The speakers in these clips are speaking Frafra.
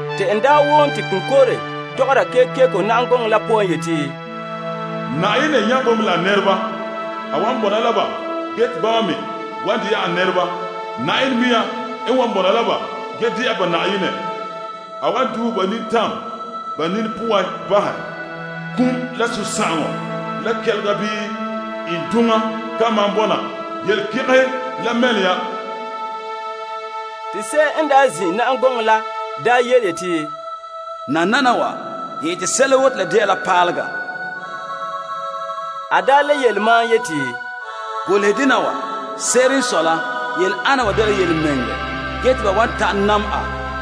Te n wom te konkore tɔgɔra kekeko na'am gɔŋɔ la poan yeti, Yenɛ nya bo mɛ la nɛreba. A wan bɔna la ba ge te bama me wa dɛna a nɛreba. Yenɛ mɛŋa n wan bɔna la ba ge dɛna ba Yenɛ. A wan duuhe ba nintam ba nini poan bahɛ. Kum, la sunsagaŋɔ la kɛlega bii iŋduŋa ka maan bɔna. Yelekɛgɛhe la mɛlom ya. Te se'em n zin' na'am gɔŋɔ la yeti, Nananawa, n ete sɛla woo te la de'a paalega. A le yele mam yeti, Golehɛ dena wa. Se'ere n sɔe la, yele ana wa dela yelemɛŋɛrɛ ge te ba wan ta'an dɛla a.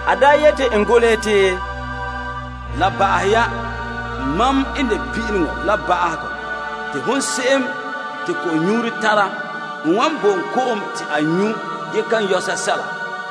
A le yeti, La ba'ahɛ ya. Mam n de Pin'ileŋɔ la Ba'ahegɔ. Te hon se'em te ko'nyuuro tara, n wan bo en vom ko'om la te a nyu' ge kan yɔ sɛsɛla.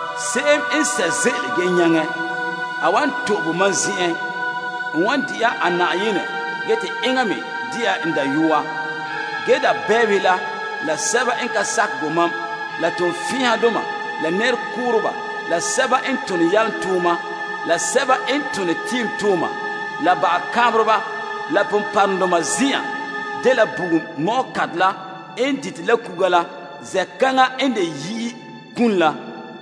Se'em n sɛ' ze'ele nyaŋɛ, a wan to'e bo mam zen'en. N wan dɛna a Yenɛ ge te enŋa me de'a n dayɔa. Ge dabɛbehe la, la sɛba n ka sakɛ bo mam, la toonfɛn'ɛhadoma, la nɛrekooreba, la sɛba n tone yalomtooma, la sɛba n tone tiimtooma, la bagakaanbereba, la ponpɔrɔŋdoma zen'an dela bugum ko'kantɛ la n dite la kuga la. Zen'kaŋa n de yi'i kum la.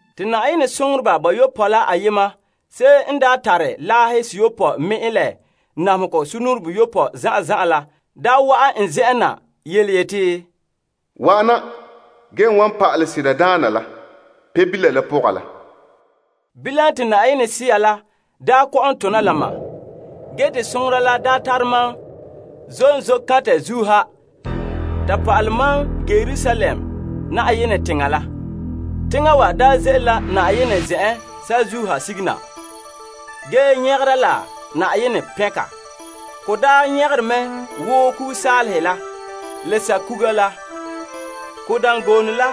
Te Yenɛ soŋoreba bayopɔe la ayema, se'em n daa tare laahe seyopɔe te se perɛ la ba'ahegɔ namehegɔ sugumnɔɔren boyopɔe la daa wa'an n zen'en na yeti, Wa'ana ge n wan pa'alɛ ho pɔka la, Pebila la pɔga la. Bilam te Yenɛ Sea la kɔ'ɔn tona la mam, ge te soŋora la tare mam zom zoore kantɛ zuo ha ta pa'alɛ mam toolom teŋa Yerusalem la. Teŋa wa ze'ele la Yenɛ zen'en saazuo ha sigera na, ge nyagera la Yenɛ soŋa. Ka nyagere mɛ wo sanlenkuga la, nyagera wo am kuga la. Ka dangoone la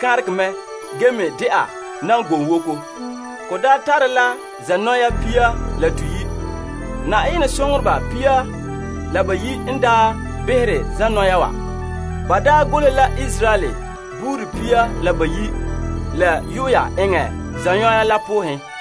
kanregɛ mɛ ge me de'a dangoonwoko. Ka tare la zanɔya pia la toyi'. Yenɛ soŋoreba pia la bayi' n behere zanɔya wa. Ba golehɛ la Israel buuri pia la bayi' la yuya eŋɛ zanɔya la poohen.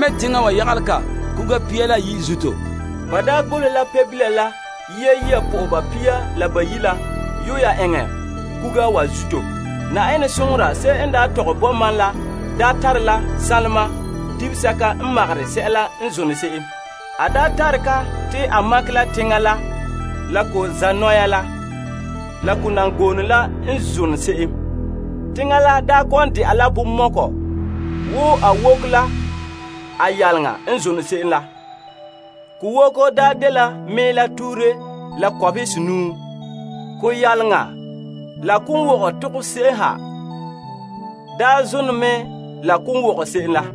Teŋa wa dangoone la ɛɛnbere mɛ' yagelɛ la kuga pia la bayi' zuto, te ba golehɛ la Pebila la tontoneba pia la bayi' la yu'ura eŋɛ kuga wa zuto. Yenɛ soŋora se'em n daa tɔgɛ bo mam la daa tare la sanlema dibesɛka n makere sɛla n zone se'em. A tara ka te a makɛ la teŋa la la ko zanɔya la, la ko dangoone la n zone se'em. Teŋa la dela bonmɔkɔ te ko woko la ko yaleŋa n zone se'em la, ko woko dela mɛɛla tuhure la kɔbehe senaahe. Koyaleŋa la konwogɛ tokɛ se'em ha zone mɛ la konwogɛ se'em la.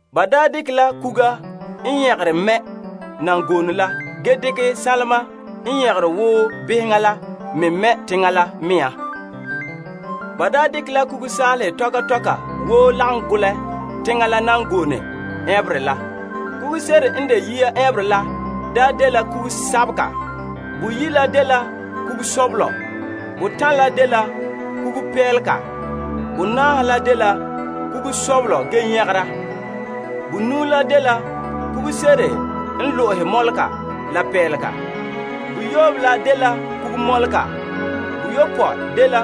Ba dekɛ la am kuga mɛ' dangoone la ge dekɛ sanlema n nyagere wo beheŋa la me mɛ teŋa la mea. Ba dekɛ la sanlenkuga tɔka tɔka woo lagom golɛ teŋa la dangoone ɛɛnberɛ la. Kuguse'ere n de yia ɛɛnberɛ la dela am kuga, boyi' la dela kuga poonhogɔ, botan' la dela kugu ponpɔnra, bonaahe la dela beheŋa kuga. Bonuu la dela kugu ponpɔnrɔsabelega, boyoobe la dela kugu mɔlebagenɛ, boyopɔe dela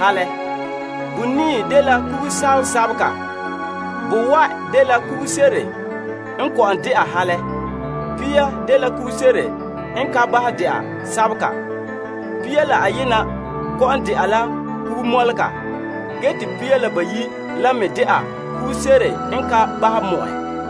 peele. Bonii dela kugu zenzengemɔlɔgɔ, bowae' dela kugu mɔlɔdɔɔnrɔ, pia dela kugu dɛnlemadɛntɔ, pia la ayena dela dɛnlemadɛnpoohogɔ, ge te pia la bayi' la me de'a mɔlɔgɔ.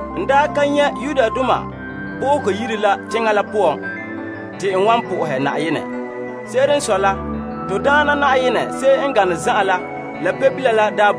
N daa ka nyɛ' Yenɛ Yire la teŋa la poan. Se'ere n sɔe la, Na'ayenɛ to Yenɛ n de Gaŋɛ Zan'an Yenɛ la Pebila la n de Yire la.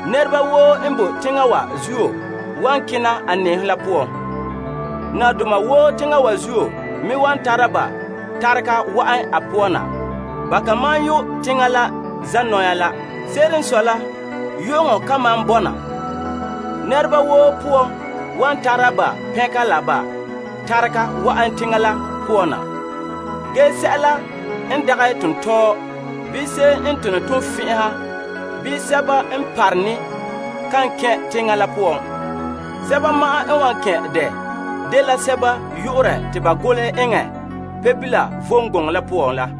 Teŋparɛ wa zuo nɛreba woo wan kena a nɛɛhom la poan. Nabadoma woo teŋa wa zuo me wan tare ba tarega wa'an a poan na. Ba ka maan yu' teŋa la zanɔya la. Se'ere n sɔe la, yu'uŋɔ kan malom bɔna. Teŋhe woo wan tare ba tarega wa'an teŋa la poan na. Ge sɛla n de dɛngerɔ, bii se'em n tone toonfɛn'ɛha, bii sɛba n parone kan kɛn' teŋa la poan. Sɛba ma'an n wan kɛn' dɛ, dela sɛba yu'ura te ba golehɛ eŋɛ Pebila vom gɔŋɔ la poan la.